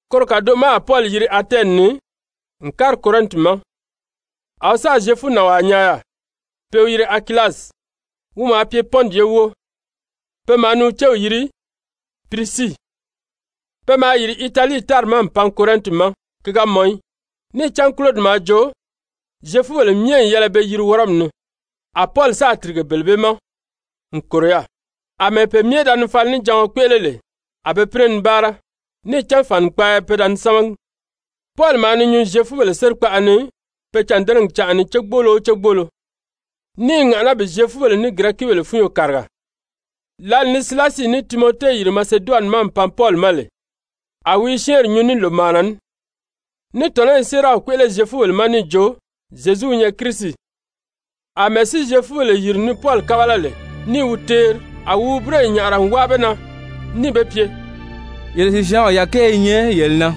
Koro kàdoʔo ma a Pɔli yiri Atɛni ni n kári Korɛnti ma. A wi sáà Zyefunànwaa nyaa yaà pe i wi yiri Akilasi, wi maa pye Pɔnti ye wóo. Pe maa ni wi céw yiri Pirisii, pe maa yìri Italii tári ma n pan Korɛnti ma ki ga mɔn í, níì cán Kulodi maa joo Zyefubèle myɛ n yɛlɛ be yiri Wɔrɔmi ni. A Pɔli sáà tìrige bele bee ma n kòro yaà. Amɛɛ pe myɛ da ni falinijaɔn kpéʔele lè, a be pínɛ ni báara, níì cán fànikpaaya pe da ni sámagi. Pɔli maa ni nyuu Zyefubèle sérikpaʔa ni pe cândɛnɛgi canʔa ni cégbolo o cégbolo, ní i ŋàʔaná bi Zyefubèle ní Girɛkibèle fúnyo kàriga. Lǎli ni Silasi ní Timɔte yìri Maseduwani ma n pan Pɔli ma lè, a wi i syɛ́ɛnri nyuu ní lòmaana ní, ní tɔ̀nɔ́ i séeraw kpéʔele Zyefubèle ma níì jo: «Zyezu wi nyɛ Kirisi.» Amɛɛ si Zyefubèle yìri ni Pɔli kábala lè ní i wi teeri, a wi wi búroyi nyàʔara n wáa be na níì be pye: «Yele sìsyaanw yàkɛɛ i nyɛ yele na!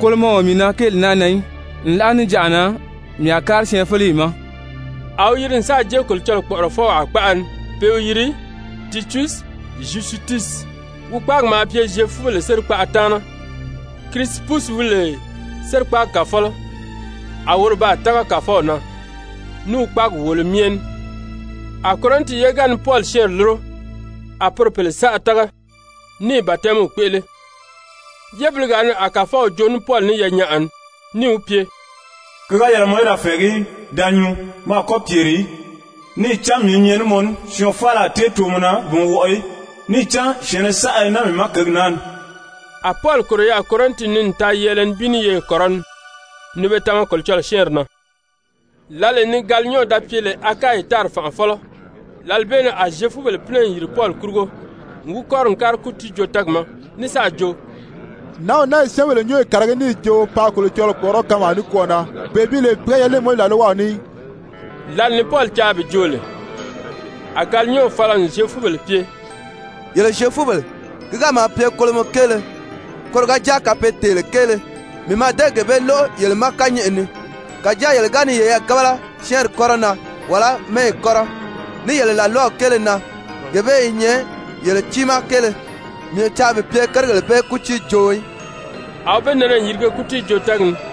Kolomɔ o mii na gi kéeli na í, nlaʔa níjanʔa na, mii a kári syɛɛnfeleyi ma.» A wi yiri n sáà jée Kolocɔlɔɔ kpɔ̀ʔɔrɔfɔwaa kpaʔa ni pe i wi yiri Tityusi Zyusitusi, wi kpáagi maa pye Zyefubèle sérikpaʔa taana. Kirisipusi wi lè sérikpaagi kàfɔlɔ, a woro baa tága Kàfɔw na ní wi kpáagi wòolo myɛ ní. A Korɛnti ye ga ni Pɔli syɛ́ɛnri lúro, a poro pèle saʔa tága, níì batɛmiw kpéʔele. Yébiligaa ni a Kàfɔw joo ní Pɔli ní yanyaʔa ni, níì wi pye: «Ki ga yɛlɛ mɔ í da fɛ̀ɛgí í, da nyuu, mɔ a kɔ́ pyèri í, níì cán mii i nyɛ ní mɔ ní, syɔɔn faala a tée too mɔ na bi mɔ wɔʔɔ í, níì cán syɛ̀ɛnnɛ saʔa i naa mii ma kěgi naa ni.» A Pɔli kòro yaà Korɛnti ni n taa yɛɛlɛ nibin ní yeye kɔrɔni, ni be tama Kolocɔlɔɔ syɛ́ɛnri na. Lǎlee ni Galiyɔn da pye lè Akayi tári fànʔafɔlɔ, lǎli bee ni a Zyefubèle pínɛ n yìri Pɔli kurugo n wi kɔ́ri n kári kútiijoo-tɛ́ɛgi ma, ní sáà jo: «Nǎnw naa i syɛ́ɛnbèle nyúnyo kàragí níì jo paa Kolocɔlɔɔ kpɔ̀ʔɔrɔ́ kanmaa nikwɔɔ na, bee bi lè pi ga yɛlɛ ní Mowizi làlwaw ní í.» Lǎli ni Pɔli caa bi joo lè, a Galiyɔn fala n Zyefubèle pye: «Yele Zyefubèle, ki ga maa pye kolomɔ kéele, koro ga jáa kapeetèele kéele, mii mǎà dée gee bee lóʔo yele ma kányɛʔɛ ni. Kàjáa yele ga ni yeyɛɛ gábala syɛ́ɛnri kɔ́rɔ na, wàlá mɛ́ɛyi kɔ́rɔ, ní yele làlwaw kéele na, gee bee i nyɛ yele tiimaa kéele. Mii o caa bi pye kérigèle bee kútiijooo í.» A wi be nɛnɛ n yirige kútiijoo-tɛ́ɛgi ni.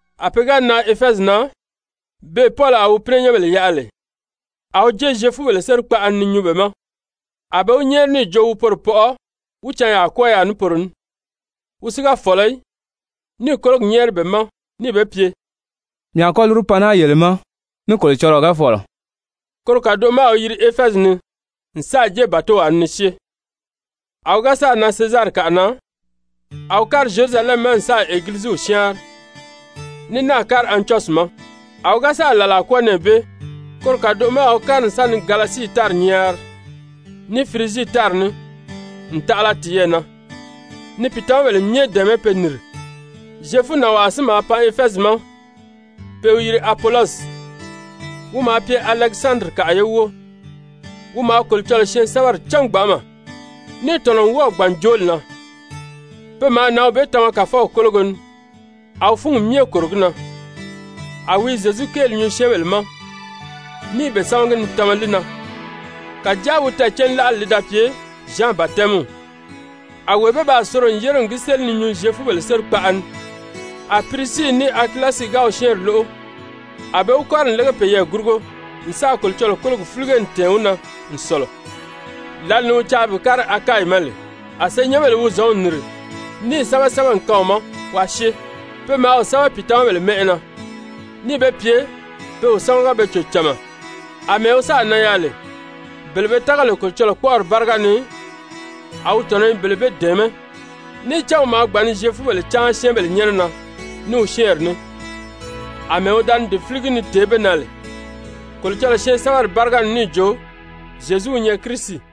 A pe ga nan Efɛzi na, beè Pɔli a wi pínɛnyɛnbèle yaʔa lè, a wi jée Zyefubèle sérikpaʔa ni ni nyuu be ma. A be wi nyɛ́ɛri níì jo wi poro pɔʔɔ wí canyaa kwɔ́ɔ yaà ní poro ní. Wi si ga fɔ̀lɔ í, níì kólogi nyɛ́ɛri be ma níì be pye: «Mii a kɔ́ lúru pan naa yele ma ní Kolocɔlɔɔ ga fɔ̀lɔ.» Koro kàdoʔo ma a wi yiri Efɛzi ni n sáà jée bàtow ni ni syée. A wi ga sáà nan Sezarikaʔa na, a wi kári Zyerusalɛmi ma n sáà Egiliziw syáanri, ní náà kári Antyɔsyi ma. A wi ga sáà làlaa kwɔ́ɔ nɛɛ bee, koro kàdoʔo ma a wi kári n sa ni Galasii tári nyaari ní Firizii tári ní n taʔala tiyɛɛ na ni pìitamabèle myɛ dɛ̀ɛmɛ́ pe nìri. Zyefunànwaa si maa pan Efɛzi ma pe i wi yiri Apolɔsi, wi maa pye Alɛkisandirikaʔa ye wóo, wi maa Kolocɔlɔɔ syɛɛnsɛbɛri cán gbanʔama, níì tɔ̀nɔ n wɔ́ɔ̀ gbàn jooli na. Pe maa nǎnw bee tama Kàfɔw kólogo ni, a wi fúngi myɛ kòro gi na, a wi i Zyezu kéeli nyuu syɛ́ɛnbèle ma ní i be sámagi ni tama li na, kàjáa wi tɛɛ̀cánlaʔali li da pye Zyan batɛmiw. A wee bee baa soro n yére n gi séli ni nyuu Zyefubèle sérikpaʔa ni. A Pirisii ní Akilasi ga wi syɛ́ɛnri lóʔo, a be wi kɔ́ri n lége peyɛɛ gurugo n sáà Kolocɔlɔɔ kólogi fílige n tɛ̀ɛn wi na n sɔ̀lɔ. Lǎlee ni wi caa bi kári Akayi ma lè, a senyɛnbèle wi zɔ̌nw nìri níì sɛ́bɛ sɛ́bɛ n kaan wi ma waa syée, pe maa wi sɛ́bɛ pìitamabèle mɛ́ʔɛ na, níì be pye pe wi sámaga be cò cama. Amɛɛ wi sáà nan yaà lè, bele be tága lè Kolocɔlɔɔ kpɔ́ʔɔri báriga ni, a wi tɔ̀nɔ́ i be dɛ̀ɛmɛ́. Níì cán wi maa gbàn ni Zyefubèle cáan syɛ́ɛnbèle nyɛ́nɛ na ní wi syɛ́ɛnri ní, àmɛɛ wi da ni gi fíligi ni tèé be na lè Kolocɔlɔɔ syɛɛnsɛbɛri báriga ni níì jo: «Zyezu wi nyɛ Kirisi.»